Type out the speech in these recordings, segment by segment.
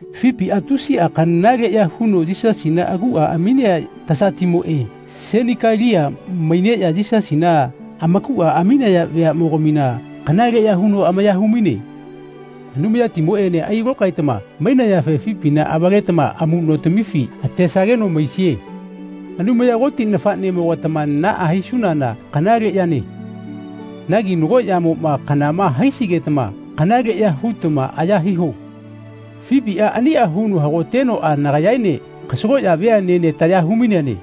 Fipiꞌa tusiꞌa kanaleꞌya huno Yisasina aguꞌa aminea tasatimoꞌe, Senikalia maineꞌya Yisasina amakuꞌa aminaya veaꞌmogamina kanaleꞌya huno amaya humaine. Anumayatimoꞌene ailokaetama mainayafe Fipina avaletama amuꞌnotamifi atesageno maisie. Anumaya Koti nafaꞌnemogatama naꞌa hisunana kanale yane. Nagi nagoꞌa yamoꞌma kanama haisigetama kanaleꞌya hutama aya hiho. Fipiꞌa aniꞌa huno hagotenoꞌa nagayaene kasagoꞌya veaꞌnene taya humaineane.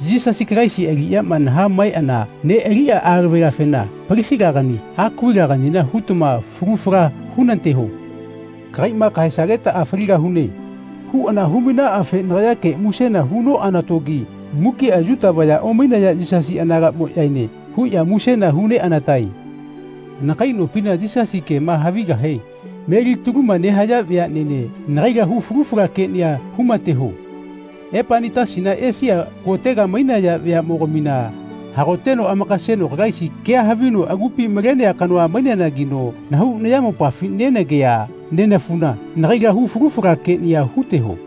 Yisasi Kalaisi aliꞌyama nahaꞌmaeꞌana neꞌaliꞌa alavelafena Palisilagani Akuvilaganina hutama falu fala hunateho. “Kagaiꞌma kahaesagetaꞌa faligahune.” huꞌana humainaꞌafe nagayake musena hunoꞌanatogi mukiꞌa Yuta vaya omainaya Yisasi anagaꞌmoꞌyaene huꞌya musena huneꞌanatae. Anakai nopima Yisasi kema havigahe melitaluma nehaya veaꞌnene nagaila hu falu fala keꞌnia humateho. Epainetasina, Esia kotega mainaya veaꞌmogamina hagoteno amakaseno Kalaisi kea havino agupi malenea kanoa maineanagino nahau nayamopafi nenagea nenafuna nagaila hu falu fala keꞌnia huteho.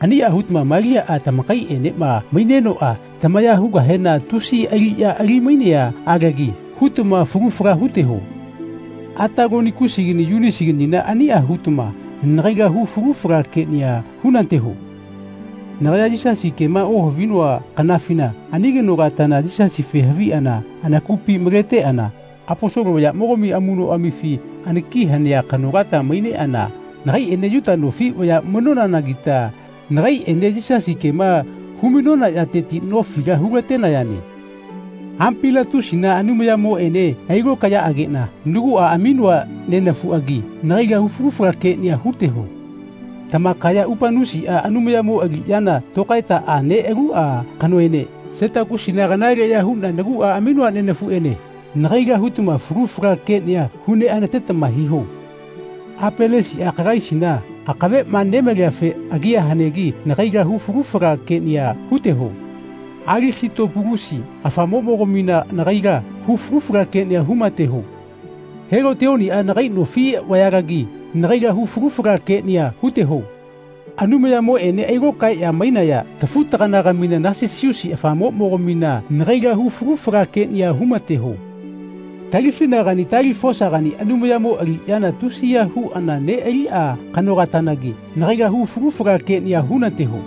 Aniꞌa hutama Maliaꞌa, tamakaiꞌenema mainenoꞌa tamaya hugahena tusi aliꞌya ali-mainea alagi hutama falu fala huteho. Atalonikusigani Yuniasiganina aniꞌa hutama nagaila hu falu fala keꞌnia hunateho. Nagaya Yisasi kema ohavinoa kanafina ani kanolatana Yisasife haviꞌana anakupi maleteꞌana Aposolo vayaꞌmogami amuꞌnoꞌamifi anaki hanea kanolata maineꞌana nagaiꞌene Yuta nofi vaya mainonanagita nagaiꞌene Yisasi kema humainona yateti nofila hulatenayane. Ampiliatusina Anumayamoꞌene ailokaeyaꞌageꞌna naguꞌa aminoa nenafuꞌagi nagaila hu falu fala keꞌnia huteho. Tamakaya Upanusiꞌa Anumayamo aliꞌyana tokaetaꞌa neꞌaluꞌa kanoene Setakisina kanaleꞌya huꞌna naguꞌa aminoa nenafuꞌene nagaila hutama falu fala keꞌnia huneꞌanatetama hiho. Apelesiꞌa Kalaisina akaveꞌma nemaliafe agia hanegi nagaila hu falu fala keꞌnia huteho. Alisitopulusi afamoꞌmogamina nagaila hu falu fala keꞌnia humateho. Helotioniꞌa nagai nofi vayalagi nagaila hu falu fala keꞌnia huteho. Anumayamoꞌene ailokaeꞌya mainaya tafu-taganagamina Nasisusi afamoꞌmogamina nagaila hu falu fala keꞌnia humateho. Talifinagani Talifosagania Anumayatimo aliꞌya tusiya huꞌana neꞌaliꞌa kanolatanagi nagaila hu falu fala keꞌnia hunateho.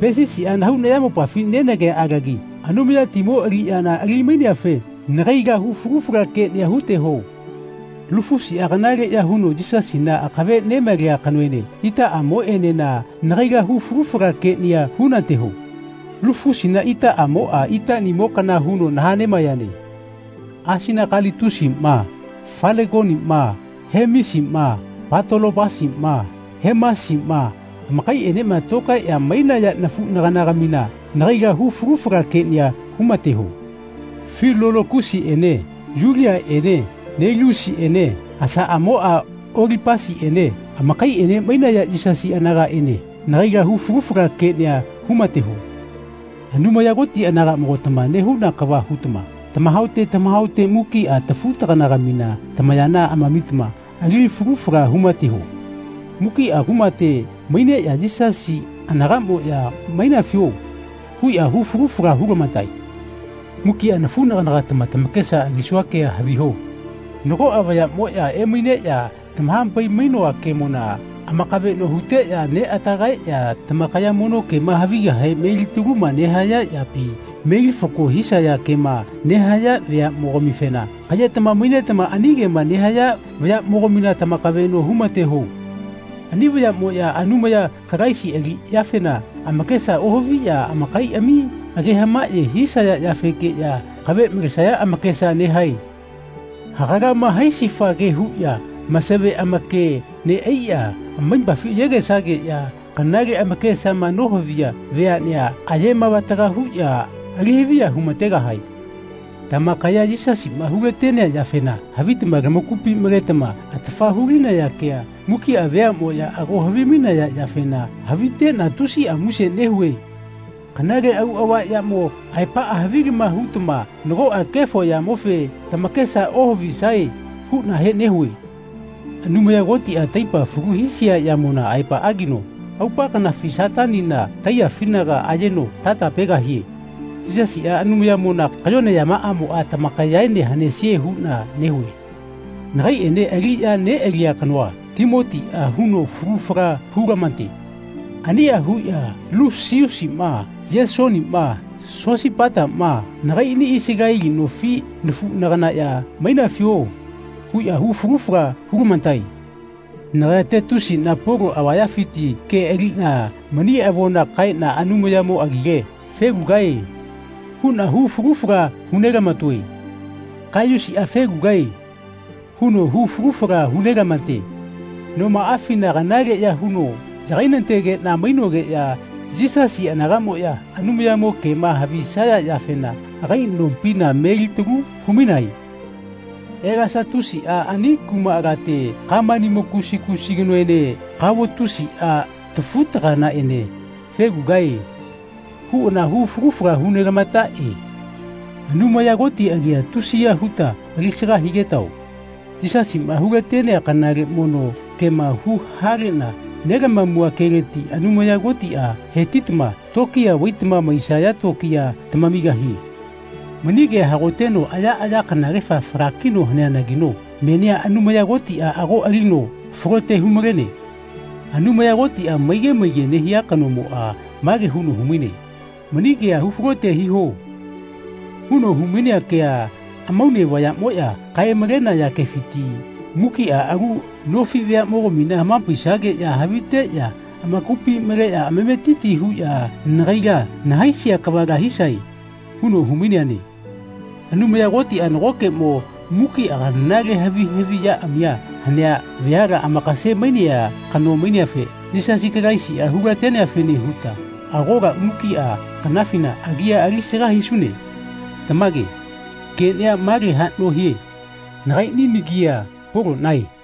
Pesisiꞌa nahau nayamopafi nenagea alagi Anumayatimo aliꞌyana ali-maineafe nagaila hu falu fala keꞌnia huteho. Lufusiꞌa kanaleꞌya huno Yisasina akave nemalea kanoene itaꞌamoꞌenena nagaila hu falu fala keꞌnia hunateho. Lufusina itaꞌamoꞌa itaꞌnimo kana huno nahaꞌnemaeyane. Asinakalitusiꞌma Falegoniꞌma Hemisiꞌma Patolopasiꞌma Hemasiꞌma amakaiꞌenema tokaeꞌya mainaya nafuꞌnaganagamina nagaila hu falu fala keꞌnia humateho. Filologusiꞌene Yuliaꞌene Neleusiꞌene asaꞌamoꞌa Olipasiꞌene amakaiꞌene mainaya Yisasi anagaꞌene nagaila hu falu fala keꞌnia humateho. Anumaya Koti anagaꞌmogatama nehuna kava hutama tamahaote tamahaote mukiꞌa tafu-taganagamina tamayana amamitama ali falu fala humateho. Mukiꞌa kumate maineꞌya Yisasi anagaꞌmoꞌya “Mainafio?” huꞌya hu falu fala hulamatae. Mukiꞌa nafuꞌnaganagatama tamakesa alisua kea haviho. Nagoꞌa vayaꞌmoꞌya emaineꞌya tamahapai-mainoa kemona amakaveꞌno huteꞌya neꞌatagaeꞌya tamakaya mono kema havigahe alitaluma nehaya yapi melifako hisaya kema nehaya vayaꞌmogamifena kaꞌyetama mainetama ani kema nehaya vayaꞌmogamina tamakaveꞌno humateho. Ani vayaꞌmoꞌya Anumaya Kalaisi aliꞌyafena amakesa ohaviꞌya amakaiꞌami age hamaꞌye hisaya yafekeꞌya akave malesaya amakesa nehae. Hagalama-haisifa ke huꞌya masave amake neꞌaiꞌya amaipafi ayegesageꞌya kanale amakesama nohaviya veaꞌnea ayemavataga huꞌya alihaviya humategahae. Tamakaya Yisasiꞌma hulatenea yafena havitama tamakupi maletama atafa hulinaya kea mukiꞌa veaꞌmoꞌya ago havimainaya yafena haviteꞌna tusiꞌa muse nehue. Kanale auꞌava yamo aepaꞌa havilama hutama nagoꞌa kefo yamofe tamakesa ohavisae huꞌnahe nehue. Anumaya Kotiꞌa, taipa falu hisia yamona aepaꞌagino, aupa kanafi Satanina taiyafinaga ayeno tatapegahie. Yisasiꞌa Anumayatimona kayone yamaꞌamoꞌa tamakayaene hanesie huꞌna nehue. Nagaiꞌene aliꞌya neꞌalia kanoa, Timotiꞌa, huno falu fala hulamate. Aniꞌa huꞌya Lusiusiꞌma Yesoniꞌma Sosipataꞌma nagaiꞌni Isaleli nofi nafuꞌnagaꞌya “Mainafio?” huꞌya hu falu fala hulamatae. Nagaya Tetiusiꞌna Polo avayafiti ke aliꞌna mani avona kaeꞌna Anumayamo agile “Felugae.” huꞌna hu falu fala hunelamatoe. Kaiyusiꞌa “Felugae.” huno hu falu fala hunelamate. Nomaꞌafina kanaleꞌya huno yagainategeꞌna mainogeꞌya Yisasi anagaꞌmoꞌya Anumayamo kema havisaya yafena agai nopina melitalu humainae. Elasatusiꞌa ani kumaꞌalate Kamanimo kusi kusi kanoene Kavotusiꞌa tafu-taganaꞌene “Felugae.” huꞌana hu falu fala hunelamataꞌe. Anumaya Koti agia tusiya huta alisaga higetao. Yisasiꞌma hulatenea kanale mono kema hu-haleꞌna nelamamua keleti Anumaya Kotiꞌa hetitama tokiya vaitama maisaya tokiya tamamigahie. Mani kea hagoteno ayaꞌaya kanagefa falakino haneanagino menia Anumaya Kotiꞌa ago alino falote humalene. Anumaya Kotiꞌa maige maige nehia kanomoꞌa mage huno humaine “Mani kea hufalote hiho.” huno humainea ke amaune vayaꞌmoꞌya kae-malenaya kefiti “Mukiꞌa alu nofi veaꞌmogamina hamapaisageꞌya haviteꞌya amakupi maleꞌya amametiti huꞌya nagaila nahaisia kava hisae.” huno humaineane. Anumaya Kotiꞌa nagokeꞌmo mukiꞌa kanale havi haviꞌyaꞌami hanea veala amakase-mainea kano maineafe Yisasi Kalaisiꞌa hulateneafene huta agola mukiꞌa kanafina agia alisaga hisune. Tamage. Keꞌnia male haꞌno hie. Nagaiꞌni nagia Poloꞌnae.